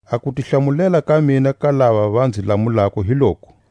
A kutihlamulela ka mina ka lava va nzi lamulako hi loku: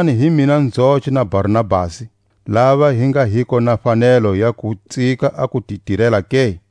Kutani hi mina nzoce na Barnabasi, lava hi nga hiko na fanelo ya ku tsika a ku ti tirela ke?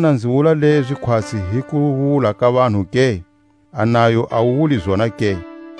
Xana nzi wula lezi khwatsi hi kuwula ka vanhu ke? A nayo a wu wuli zona ke?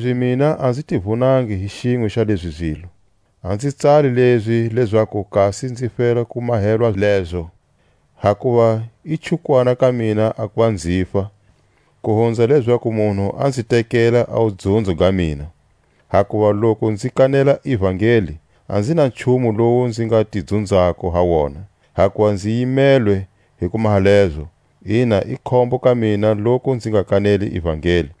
Kanilezi mina a nzi ti vunangi hi xinwe xa lezi zilo. A nzi tsali lezi lezaku kasi nzi fela ku mahelwa lezo; hakuva i chukwana ka mina a kuva nzifa, ku hunza lezaku munhu a nzi tekela a wudzunzo ga mina. Hakuva loku nzi kanela ivangeli, a nzi na nchumu lowu nzi nga ti dzunzako ha wona; hakuva nzi yimelwe hi ku maha lezo, ina i khombo ka mina loku nzi nga kaneli ivangeli.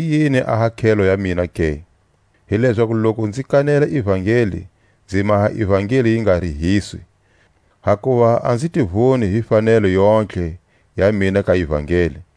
Hi yini a hakhelo ya mina ke? Hi lezaku loku nzi kanela ivangeli nzi maha ivangeli yi nga rihiswi, hakuva a nzi ti vuni hi fanelo yontlhe ya mina ka ivangeli.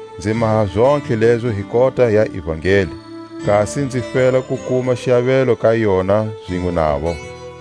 Nzi maha zontlhe lezo hi kota ya ivangeli, kasi nzi fela ku kuma xiavelo ka yona zinwe navo.